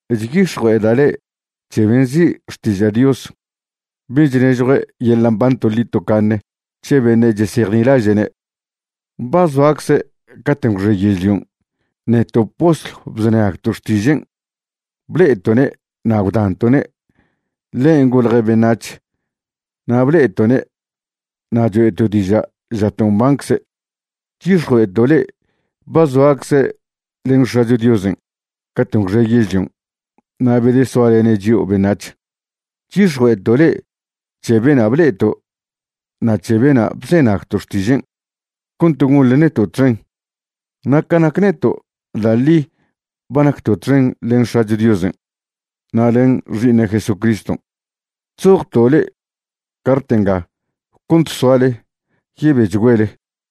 Chyix̱jue'eda' le'e c̱he ben' nzi' Xtiža' Dios, ben' chnežjue' yeḻa' mban toḻi tocaṉe c̱he beṉe' chesejnilaže'ne'. Ba zoacze' caten' gwxe yežlion'. Neto' postlw bzenagto' xtižen', ble'eto'ne' na' gwdanto'ne'. Ḻen' golje' beṉac̱h na' ble'eto'ne' na' choe'to' diža' žato' mbancze'. Chyix̱jue'eto' le'e ba zoacze' len X̱acho Diosen' caten' gwxe yežlion' na' bedesoalene' chio' beṉac̱h. Chyix̱jue'eto' le'e c̱he bena' ble'eto' na' c̱he bena' bzenagto' xtižen' cont gonḻe neto' txen. Na' ca nac neto', da' ḻi ba nacto' txen len X̱acho Diosen' na' len Xi'iṉe' Jesucriston'. Chzojto' le'e cart nga cont soale yebechgüele.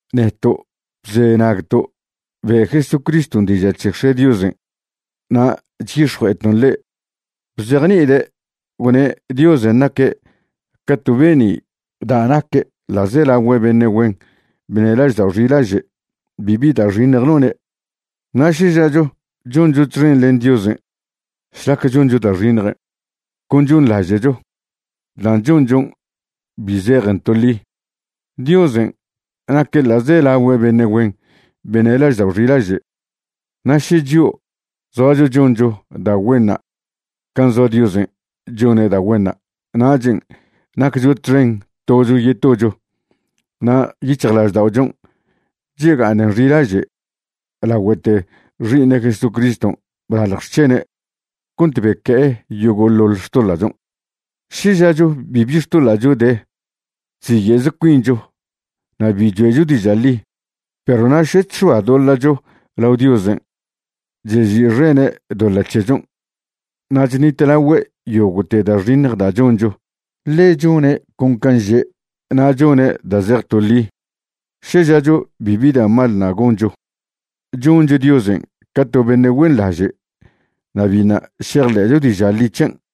Neto' bzenagto' be' Jesucriston' diža' c̱he X̱e' Diosen' na' chyix̱jue'eton' le'e, bzejni'ide' gwne' Diosen' naque' ca to be'ni' da' naque' ḻa'zelagüe beṉe' güen beṉe' laždao' xilaže'. Bibi da' xiṉj none'. Na' še žacho choncho txen len Diosen' šlac choncho da' xiṉjen', con chonḻaže'cho. Dan' chonchon' bi zejen to ḻi. Diosen' naque' ḻa'zelagüe beṉe' güen beṉe' laždao' xilaže'. Na' še chio' zoacho choncho da' güenṉa' can' zoa Diosen' chone' da' güenṉa', nachen' naccho txen tocho yetocho na' yic̱hjlažda'ochon' chega'aṉen xilaže' lagüete Xi'iṉe' Jesucriston' blalj xc̱hene' cont beque'e yogo'ḻoḻ xtoḻa'chon'. Še žacho bibi xtoḻa'cho de, chziye'ze cuinchon' na' bi choe'cho diža' ḻi. Perw na' še chx̱oadoḻa'cho lao Diosen', chezi'xene' doḻa' c̱hechon' na' chṉitlagüe' yogo'te da' xiṉj da' choncho, ḻe chone' con can' že' na' chone' da' zej to ḻi. Še žacho bibi da' mal ṉa' goncho, choncho Diosen' ca to beṉe' güenḻaže' na' biṉa' šejḻe'cho diža' ḻi c̱hen'.